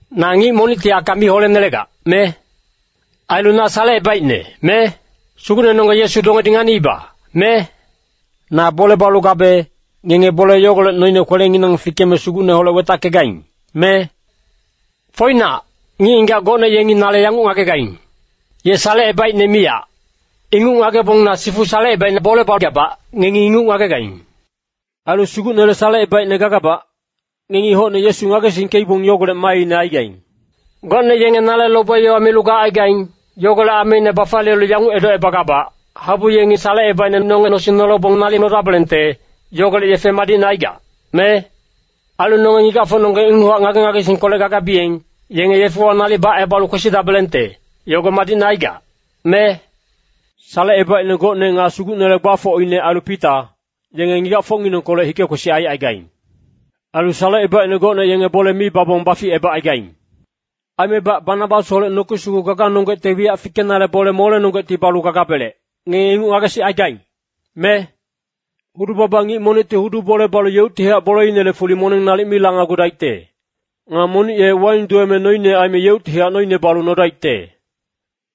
Na ngic monicti aka mi holenelegac, me? Ailu na salecebaicne, me? Sugucnenonggeng Yesu dongedi nganiiba, me? Na bole balu gabe, ngenge bole yogolec noine kwelenginang fikeme Sugucneholec wetackegaing, me? Foinac, ngic-ngigac gocne yengi nale yanguc ngagegaing, “Ye salecebaicne miyac.” Inguc ngagebong na sifu salecebaicne bole bagabac, ngengi inguc ngagegaing. Ailu Sugucnele salecebaicne gagabac, ngengi hocne Yesu ngagesingkeibong yogolec maaine aigaing. Gocne yenge nale lobe-yowa milu gacaigaing, yogolec ameine bafaliyelu yanguc edocebagabac, Habu yengi salecebaicne nonge nosing nolebong nalic nodabelengte, yogolec yefe madicne aigac, me? Ailu nonge ngigacfocnonggeng inguchac ngage-ngagesingkolec gagabiyeng, yenge yefewa nalic bacebalu kwesidabelengte, yogo madicne aigac, me? Salecebaicne gocne nga Sugucnele gbafocine ailu Pita, yenge ngigacfocnginengkolec hike-kwesic aicaigaing. Ailu salecebaicne gocne yenge bole mi babong baficebacaigaing. Aimebac Banabasholec noki sugu gaganonggecte wiyac fikenale bole molenonggecti balu gagabelec, ngenge inguc ngagesicaigaing, me? Hudu-baba ngic monicti hudu bole balu yeuctihac boleinele fuli moneng nalic mi lanagudaicte. Nga monic ye waing duweme noine aime yeuctihac noine balu nodaicte.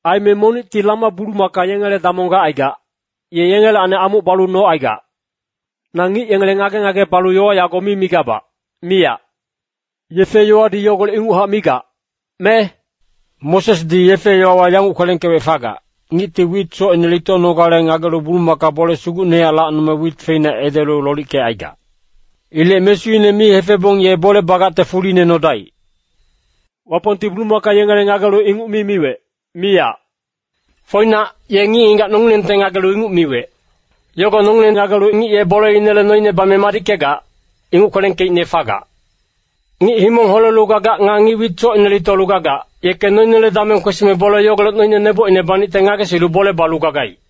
Aime monicti lama-bulumaka yengele damong gacaigac, ye yengelacni amuc balu nocaigac. Na ngic yengele ngage-ngage balu yowa yago mi migabac, miyac. Yefe-yowadi yogolec inguchac migac, me? Mosesdi yefe-yowawa yanguc kwelengkewec fagac, “Ngicti wit socine litonogale ngagelu bulumaka bole sugucnehac lacnome wit feina edelu lolickecaigac. Ilec mesuine mi hefebong ye bole bagacte fuline nodaic.” Wapongti bulumaka yengele ngagelu inguc mi miwec, miyac. Foinac, ye ngic-ngigac nongilengte ngagelu inguc miwec. Yogo nongileng ngagelu ngic ye boleinele noine bame madickegac, inguc kwelengkeicne fagac. Ngic himong holelu gagac nga ngic wit socine litolu gagac, yeke noinele dameng kwesime bole yogolec noine nebocine banicte ngagesilu bole balu gagaic.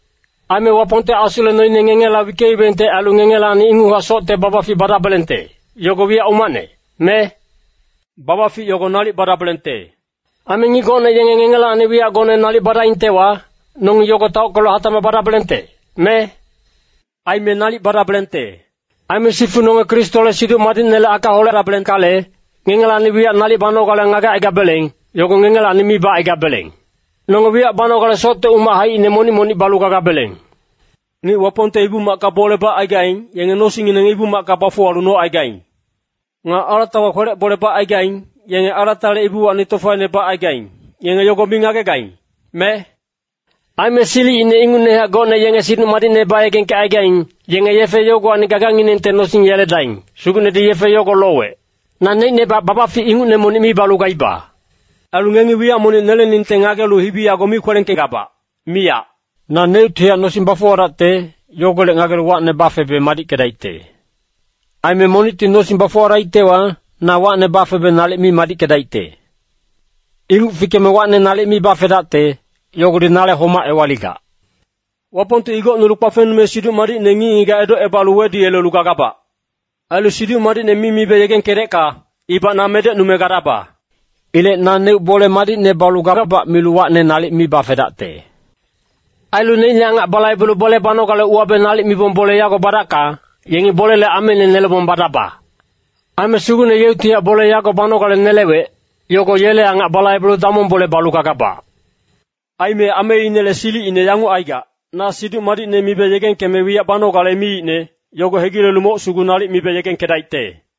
Aime Wapongte Asule noine ngengela wickeibengte ailu ngengelacni inguchac socte babafic badabelengte, yogo wiyac umacne, me? Babafic yogo nalic badabelengte. Aime ngic gocne yenge ngengelacni wiyac gocne nalic badaingtewa, nongi yogo taockelu hatacmac badabelengte, me? Aime nalic badabelengte. Aime sifu nonge Kristole Siduc Madicnele aka holedabelengkale, ngengelacni wiyac nalic banogale ngagecaigabeleng, yogo ngengelacni mi bacaigabeleng. Nonge wiyac banogale socte umac haicine monic-monic balu gagabeleng. Ngic Wapongte Ibu-macka bole bacaigaing, yenge nosingngineng Ibu-macka bafuwalu nocaigaing. Nga alatawa kwelec bole bacaigaing, yenge alatale ibuwacni tofaine bacaigaing, ngenge yogo mi ngagegaing, me? Aime silicine ingucnehac gocne yenge Siduc Madicne bayegengkecaigaing, yenge yefe yogowacni gaganginengte nosing yeledaing, Sugucnedi yefe yogo lowec. Naneicnebac babafic ingucne monic mi balu gaiba. Ailu ngengi wiyac monic neleningte ngagelu hibi yago mi kwelengkegabac, miyac. Naneuctihac nosing bafuwadacte, yogolec ngagelu wacne bafebe madickedaicte. Aime monicti nosing baficnudaictewa, na wacne bafebe nalic mi madickedaicte. Inguc fikeme wacne nalic mi bafedacte, yogodi nale homac ewaligac. Wapongti igocnulu kpafengnume Siduc Madicne ngic-ngigac edocebalu weduyelelu gagabac. Ailu Siduc Madicne mi mibe yegengkedecka, ibac na medecnume gadaba. Ilec naneuc bole madicne balu gagabac milu wacne nalic mi bafedacte. Ailu neicne angac balaibelu bole banogale uwabe nalic mibong bole yago badacka, yengi bolele ameine nelebong badaba. Aime Sugucne yeuctihac bole yago banogale nelewec, yogo yele angac balaibelu damong bole balu gagabac. Aime ameinele silicine yanguc aigac, na Siduc Madicne mibe yegengkeme wiyac banogale miicne, yogo hegilelu moc sugu nalic mibe yegengkedaicte.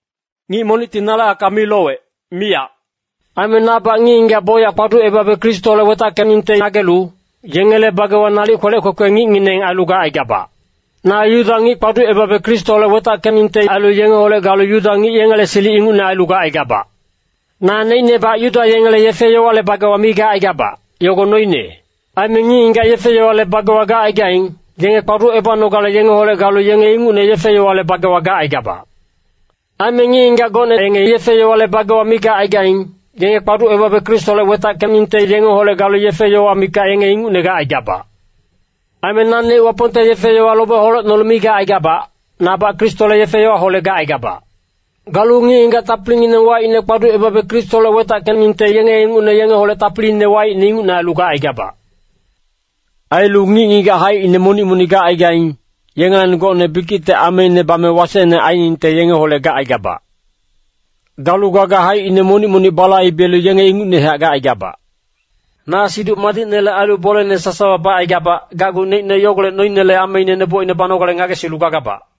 Ngic monicti nale aka mi lowec, miyac. Aime nabac ngic-ngigac bocyac kpaducebabe Kristoholec wetackeningte ngagelu, yengele bagewa nalic kwelec kwekwe ngicngineng ailu gacaigabac. Na Yuda ngic-ngigac kpaducebabe Kristoholec wetackeningte ailu yengeholec galu Yuda ngic-ngigac yengele silic ingucne ailu gacaigabac. Naneicnebac Yuda yengele yefe-yowale bagewa mi gacaigabac, yogo noine. Aime ngic-ngigac yefe-yowale bagewa gacaigaing, yenge kpaducebanogale yengeholec galu yenge ingucne yefe-yowale bagewa gacaigabac. Aime ngic-ngigac gocne yenge yefe-yowale bagewa mi gacaigaing, yenge kpaducebabe Kristoholec wetackeningte yengeholec galu yefe-yowa mikac yenge ingucne gacaigabac. Aime naneuc Wapongte yefe-yowa lobe holecnolu mi gacaigabac, nabac Kristole yefe-yowaholec gacaigabac. Galu ngic-ngigac tapilingineng waicne kpaducebabe Kristoholec wetackeningte yenge ingucne yengeholec tapiline waicne ingucne ailu gacaigabac. Ailu ngic-ngigac haicine monic-monic gacaigaing, yengelacni gocne bikicte ameine bame wasecne ainingte yengeholec gacaigabac. Galu gaga haicine monic-monic balaibelu yenge ingucnehac gacaigabac. Na Siduc Madicnele ailu bolene sasawa bacaigabac, gacgu neicne yogolec noinele ameine nebocine banogale ngagesilu gagabac.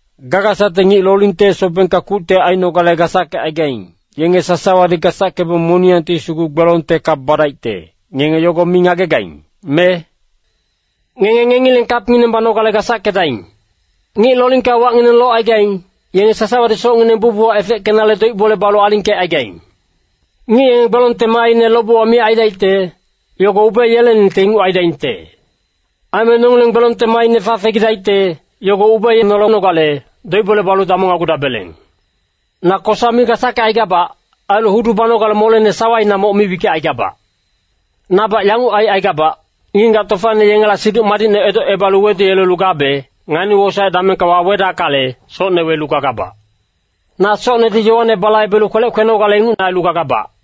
Gagasacte ngic lolingte sobengka kucte ainogale gasackecaigaing, yenge sasawadi gasackebong moniyangti sugu gbelongte kap badaicte, ngenge yogo mi ngagegaing, me? Ngenge ngengileng kapngineng banogale gasackedaing. Ngic lolingka wacngineng locaigaing, yenge sasawadi socngineng bucbuchac efeckenale doic-bole balu alingkecaigaing. Ngic yenge gbelongte maaine lobewa miyac aidaicte, yogo ubeeyeleningte inguc aidaingte. Aime nongileng gbelongte maaine fafegidaicte, yogo ubeenolenogale, doic-bole balu damongnagugabeleng. Na kosa mi gasackecaigabac. Ailu hudu banogale molene sawaina moc mi wickecaigabac. Nabac yanguc aicaigabac, ngic-ngigac tofaine yengela Siduc Madicne edocebalu weduyelelu gabe, ngani-wosaec damengka wawedackale, socne welu gagabac. Na socnedi yowane balaibelu kwelec kwenogale inguc ailu gagabac.